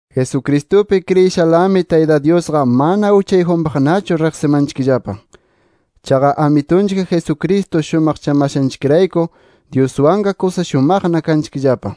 Jesucristupi kriyishalami, Tayta Dyusqa mana uchayjunpaqnachu riqsimanchikllapa. Chaqa Amitunchik Jesucristo shumaqchamashanchikrayku, Dyuswanqa kusa shumaqna kanchikllapa.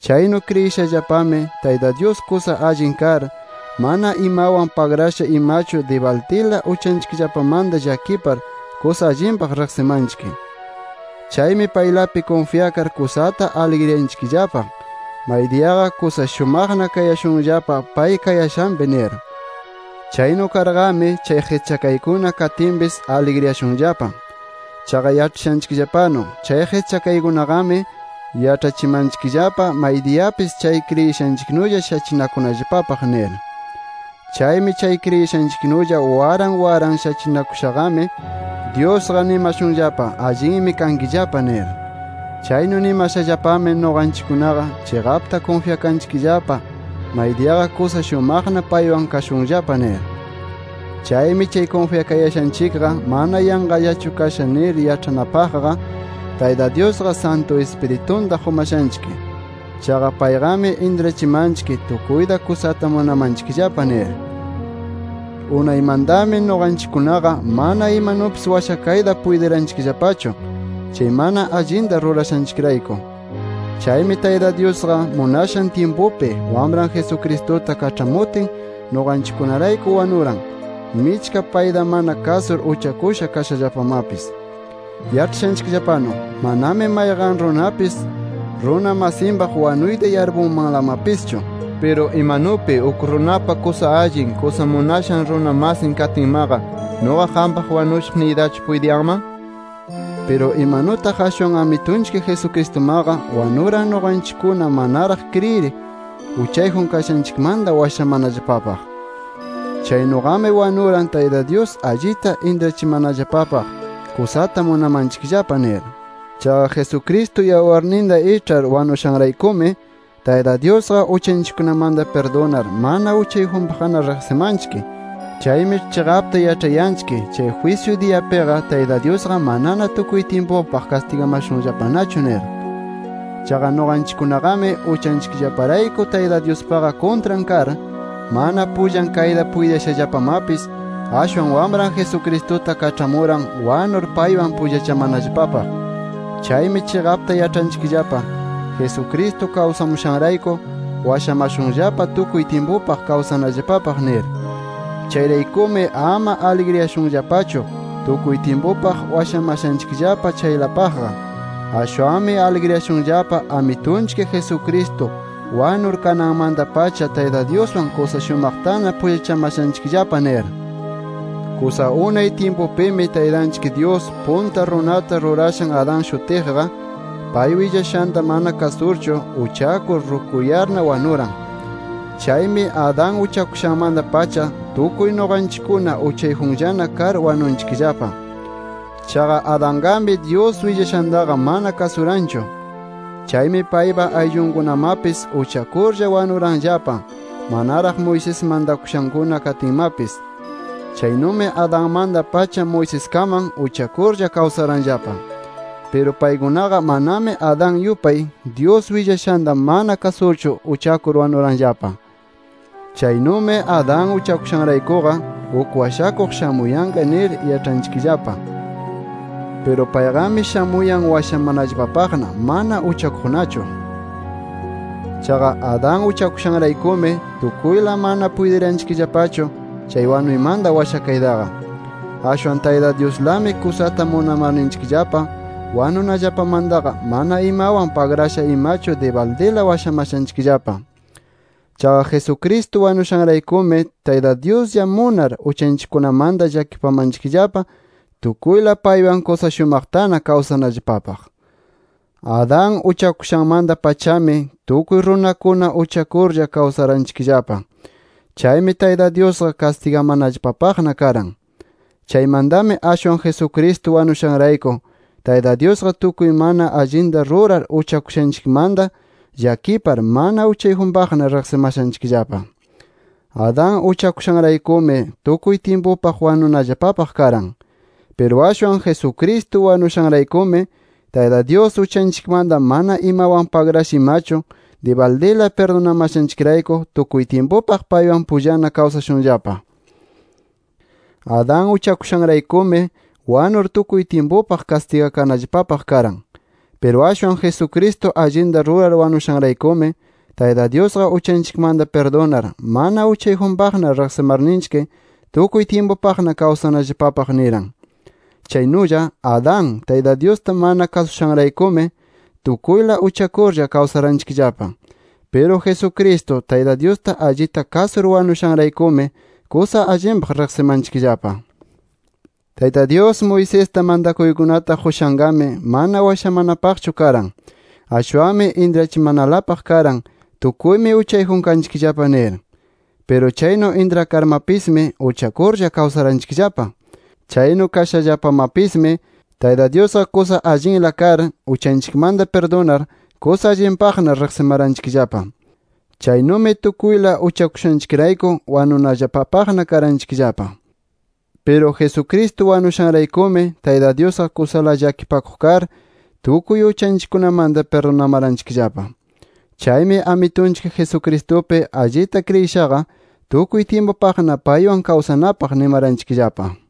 Chaynu kriyishallapami, Tayta Dyus kusa allin kar, mana imawan pagrasha imachu dibaldila uchanchikllapamanta llakipar kusa allinpaq riqsimanchik. Chaymi paylapi kunfyakar kusata aligriyanchikllapa, maydiyaqa kusa shumaqna kashunllapa pay kayashanpi nir. Chaynu karqami, chay qischakaykuna katinpis aligriyashunllapa. Chaqa yaĉhashanchikllapanu, chay qischakaykunaqami yaĉhachimanchikllapa maydiyapis chay kriyishanchiknulla shachinakunallapapaq nir. Chaymi chay kriyishanchiknulla waran waran shachinakushaqami, Dyusqa nimashunllapa allinmi kankillapa nir. Chaynu nimashallapami nuqanchikkunaqa chiqapta kunfyakanchikllapa maydiyaqa kusa shumaqna paywan kashunllapa nir. Chaymi chay kunfyakayashanchikqa mana yanqallachu kasha nir yaĉhanapaqqa, Tayta Dyusqa Santu Ispiritunta qumashanchik. Chaqa payqami intrachimanchik tukuyta kusata munamanchikllapa nir. Unaymantami nuqanchikkunaqa mana imanupis washakayta puytiranchikllapachu, chay mana allinta rurashanchikrayku. Chaymi Tayta Dyusqa munashan tyimpupi, Wamran Jesucristuta kaĉhamutin nuqanchikkunarayku wanuran, michka payta mana kasur uchakusha kashallapamapis. Yaĉhashanchikllapanu manami mayqan runapis, runa masinpaq wanuyta yarpunmanlamapischu. ¿Piru imanupi uk runapa kusa allin, kusa munashan runa masin katinmaqa, nuqa qampaq wanushaq niytachu puytiyanman? Piru imanutaq ashwan Amitunchik Jesucristumaqa wanuran nuqanchikkuna manaraq kriyir uchayjun kashanchikmanta washamanallapapaq. Chaynuqami wanuran, Tayta Dyus allita intrachimanallapapaq kusata munamanchikllapa nir. Chaqa Jesucristo yawarninta iĉhar wanushanraykumi, Tayta Dyusqa uchanchikkunamanta pirdunar mana uchayjunpaqna riqsimashanchik. Chaymi chiqapta yaĉhayanchik, jwisyu diyapiqa Tayta Dyusqa manana tukuy tyimpupaq kastigamashunllapanachu nir. Chaqa nuqanchikkunaqami uchanchikllaparayku Tayta Dyuspaqa kuntran kar, mana pullan kayta puytiyashallapamapis, ashwan Wamran Jesucristuta kaĉhamuran wanur paywan pullachamanallapapaq. Chaymi chiqapta yaĉhanchikllapa, Jesucristo kawsamushanrayku washamashunllapa tukuy tyimpupaq kawsanallapapaq nir. Chayraykumi ama aligriyashunllapachu tukuy tyimpupaq washamashanchikllapa chaylapaqqa. Ashwanmi aligriyashunllapa Amitunchik Jesucristo wanur kananmanta-pacha Tayta Dyuswan kusa shumaqtana pullachamashanchikllapa nir. Kusa unay tyimpupimi, Taytanchik Dyus punta runata rurashan Adán shutiqqa, pay willashanta mana kasurchu uchakur, rukuyarna wanuran. Chaymi Adán uchakushanmanta-pacha, tukuy nuqanchikkuna uchayjunllana kar wanunchikllapa. Chaqa Adanqami Dyus willashantaqa mana kasuranchu. Chaymi paypa ayllunkunamapis uchakurlla wanuranllapa manaraq Moisés mantakushankuna katinmapis. Chaynumi Adanmanta-pacha Moiseskaman uchakurlla kawsaranllapa. Piru paykunaqa manami Adán yupay, Dyus willashanta mana kasurchu uchakur wanuranllapa. Chaynumi Adán uchakushanraykuqa uk washakuq shamuyanqa nir yaĉhanchikllapa. Piru payqami shamuyan washamanallapapaqna mana uchakuqnachu. Chaqa Adán uchakushanraykumi, tukuyla mana puytiranchikllapachu chay wanuymanta washakaytaqa. Ashwan Tayta Dyuslami kusata munamarninchikllapa wanunallapamantaqa mana imawan pagrasha imachu dibaldila washamashanchikllapa. Chaqa Jesucristo wanushanraykumi, Tayta Dyuslla munar uchanchikkunamanta llakipamanchikllapa tukuyla paywan kusa shumaqtana kawsanallapapaq. Adán uchakushanmanta-pachami tukuy runakuna uchakurlla kawsaranchikllapa. Chaymi Tayta Dyusqa kastigamanallapapaqna karan. Chaymantami ashwan Jesucristo wanushanrayku, Tayta Dyusqa tukuy mana allinta rurar uchakushanchikmanta llakipar, mana uchayjunpaqna riqsimashanchikllapa. Adán uchakushanraykumi tukuy tyimpupaq wanunallapapaq karan. Piru ashwan Jesucristo wanushanraykumi, Tayta Dyus uchanchikmanta mana imawan pagrasha imachu, dibaldila pirdunamashanchikrayku tukuy tyimpupaq paywan pullana kawsashunllapa. Adán uchakushanraykumi, wanur tukuy tyimpupaq kastigakanallapapaq karan. Piru ashwan Jesucristo allinta rurar wanushanraykumi, Tayta Dyusqa uchanchikmanta pirdunar, mana uchayjunpaqna riqsimarninchik tukuy tyimpupaqna kawsanallapapaq niran. Chaynulla Adán, Tayta Dyusta mana kasushanraykumi, tukuyla uchakurlla kawsaranchikllapa. Piru Jesucristo, Tayta Dyusta allita kasur wanushanraykumi, kusa allinpaq riqsimanchikllapa. Tayta Dyus, Moisesta mantakuykunata qushanqami, mana washamanapaqchu karan. Ashwanmi intrachimanalapaq karan tukuymi uchayjun kanchikllapa nir. Piru chaynu intrakarmapismi, uchakurlla kawsaranchikllapa. Chaynu kashallapamapismi, Tayta Dyusqa kusa allinla kar uchanchikmanta pirdunar kusa allinpaqna riqsimaranchikllapa. Chaynumi tukuyla uchakushanchikrayku wanunallapapaqna karanchikllapa. Piru Jesucristo wanushanraykumi, Tayta Dyusqa kusala llakipakuq kar, tukuy uchanchikkunamanta pirdunamaranchikllapa. Chaymi Amitunchik Jesucristupi allita kriyishaqa tukuy tyimpupaqna paywan kawsanapaq nimaranchikllapa.